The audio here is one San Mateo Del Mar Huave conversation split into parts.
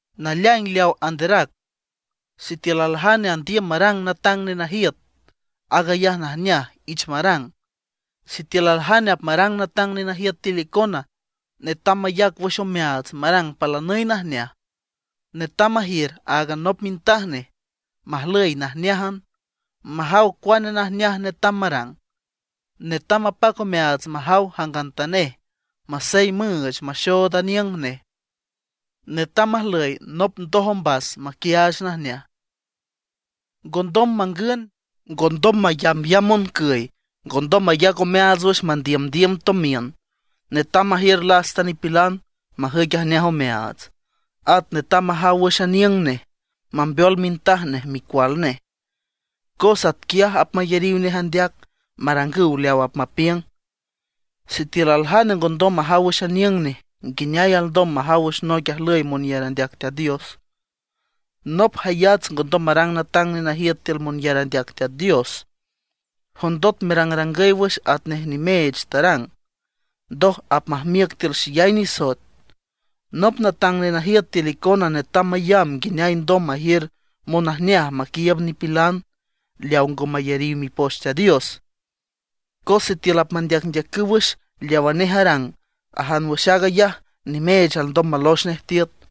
Naleaing leaw anderac: Sitiül aljane andiüm marang natang nenajiüt, aag ayaj najneaj, ich marang. Sitiül aljane apmarang natang nenajiüt tiül icona, netam mayac wüx omeaats marang palanüy najneaj. Netam majiür áagan nop mintaj nej, majlüy najneájan, majaw cuane najneaj netam marang. Netam mapac omeaats majaw jangantanej masey müüch maxood aniüng nej; netam majlüy nop ndoj ombas maquiaach najneaj. Ngondom mangün, ngondom mayambyamb moncüy, ngondom mayac omeaats wüx mandiümdiüm tomiün. Netam majiür lasta nipilan, majüic ajneaj omeaats. At netam majaw wüx aniüng nej, mambeol mintaj nej micual nej, cos atquiaj apmayariw nej andeac, marangüw leawa apmapiüng. Sitiül aljane ngondom majaw wüx aniüng nej, nguineay alndom majaw wüx noic ajlüy monyar andeac Teat Dios. Nop jayats ngondom marang natang nenajiüt tiül monyar andeac Teat Dios, jondot merangrangüy wüx atnej nimeech tarang, ndoj apmajmiüc tiül xeyay nisoet. Nop natang nenajiüt tiül icona netam mayamb nguineay alndom majiür monajneaj maquiiüb nipilan leawa ngo mayariw Mipoch Teat Dios. Cos sitiül apmandeacndeacüw wüx leawa nej arang, ajan wüx aag ayaj nimeech alndom malox nej tiüt.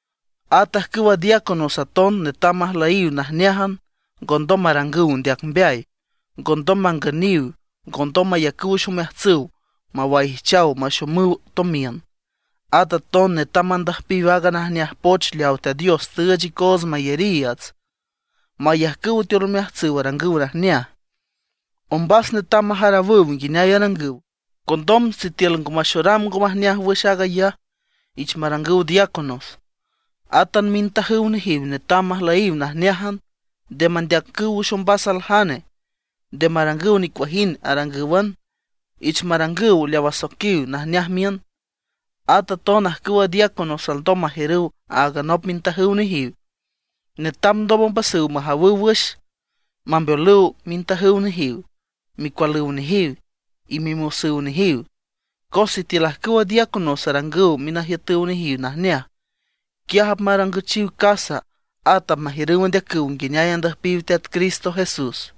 At ajcüwa diáconos aton netam majlüyiw najneájan, ngondom marangüw ndeac mbeay, ngondom mangüniw, ngondom mayacüw wüx omeajtsüw mawaijchaw maxomüw tomiün. At aton netam mandüjpiw aaga najneaj poch leaw Teat Dios tüüch icoots mayariiüts, mayajcüw tiül omeajtsüw arangüw najneaj. Ombas netam majarawüw nguineay arangüw, condom sitiül ngo maxoram ngo majneaj wüx aag ayaj, ich marangüw diáconos. Átan mintajüw nejiw netam majlüyiw najneájan, nde mandeacüw wüx ombas aljane. Nde marangüw nicuajind arangǘwan; ich marangüw leaw asoiquiw najneaj miün. At aton ajcüwa diáconos alndom majiürüw áagan nop mintajüw nejiw. Netam ndom ombasüw majawüw wüx, mambeolüw mintajüw nejiw, micualüw nejiw, y mimosüw nejiw. Cos sitiül ajcüwa diáconos arangüw minajiütüw nejiw najneaj, quiaj apmarangüchiw casa, at apmajiürüw andeacüw nguineay andüjpiw Teat Cristo Jesús.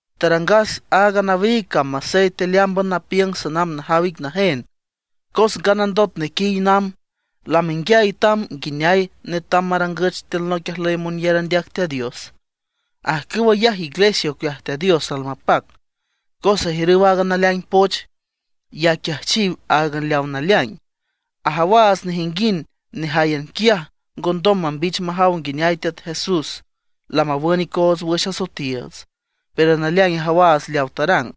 Tarangas aaga nawiig cam masey tealeámban napiüng sanamb najaw ic najen. Cos nganandot nequiy namb, lamenguiay tam nguineay netam marangüch tiül noic ajlüy monyar andeac Teat Dios, ajcüw ayaj iglesia ocueaj Teat Dios almapac; cos ajiürüw aaga naleaing poch, y aquiajchiw áagan leawa naleaing. Ajawaats nejinguind nejáyan quiaj ngondom mambich majaw nguineay Teat Jesús lamawün icoots wüx asoetiiüts. Pero naleaing ajawaats leawa tarang: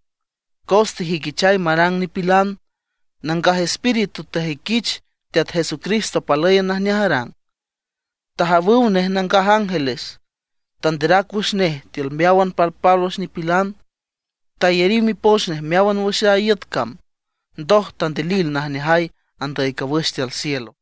Cos tejüiquichay marang nipilan; Nangaj Espíritu tajüiquich Teat Jesucristo palǘyan najneaj arang, tajawüw nej nangaj ángeles. Tanderac wüx nej tiül meáwan palpálwüx nipilan; tayariw mipoch nej meáwan wüx a iüt cam; ndoj tandilil najneajay andüy cawüx tiül cielo.